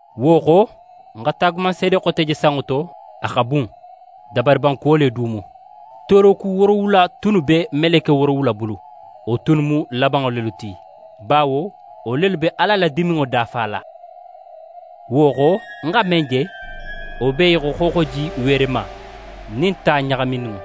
Wo xo, ń xa taagumanseede xote je sanŋo to, a xa bun, dabariban kuwo le du mu: Tooroku woorowula tunnu be meleke woorowula bulu. Wo tunnu mu labanŋo lelu ti, bawo wo lelu be Ala la diminŋo dafala. Wo xo, ń xa men je, wo be í xo xooxoji weerema nin ta ɲaxamininŋo.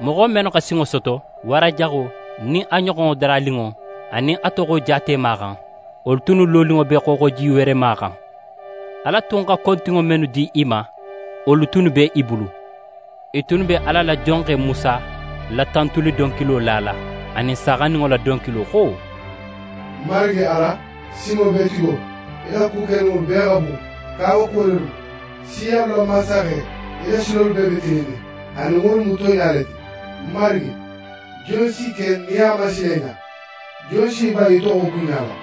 Moxo mennu xa sinŋo soto wara jaxo nin a ɲoxonŋo daraninŋo anin a toxo jaatema xan, wolu tunnu loninŋo be xooxoji weerema xan. Ala tun xa kontinŋo mennu di i ma, wolu tunnu be i bulu. I tunnu be Ala la jonxe Musa la tantuli donkilo lala anin Saaxandinŋo la donkilo xo: «Marigi Ala, Sinŋobeetigo, í la ku keninŋolu bee xa bun, kawakuwo lelu mu! Siyalu la Mansaxe, í la silolu bee be tilinnin anin wolu mu tonɲa le ti! Marigi, jon si ke nin a man sila í ɲa? Jon si í ban í toxo bunɲala?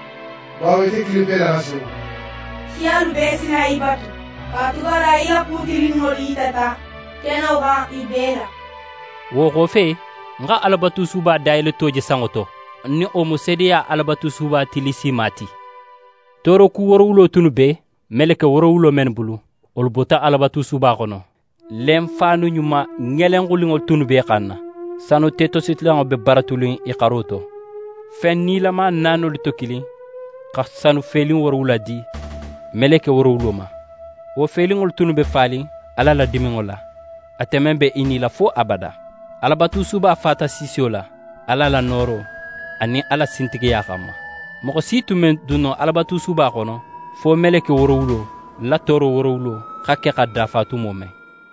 Bawo ite kilinpe le xa senu. Siyalu bee si na í batu, katugala í la ku tilinninŋolu yitata keno xan i bee la.» Wo xofe, ń xa Alabatusuba dayeleto je sanŋo to, nin wo mu seedeya Alabatusuba tillisima ti. Tooroku woorowulo tunnu be meleke woorowulo mennu bulu, wolu bota Alabatusuba xono. Lenfaanu ɲuma ŋelenxuninŋolu tunnu b'e xanna, sanu tetositilanŋo be baratunin i xaro to. Fen nilama naanolu to kilin xa sanu felin woorowula di meleke woorowulo ma. Wo felinŋolu tunnu be fanin Ala la diminŋo la, ate men be í nila fo abada. Alabatusuba fata siisiyo la, Ala la nooro anin a la sintigiya xanma. Moxo si tun me dun no Alabatusuba xono fo meleke woorowulo la tooro woorowulo xa ke xa dafa tumo men.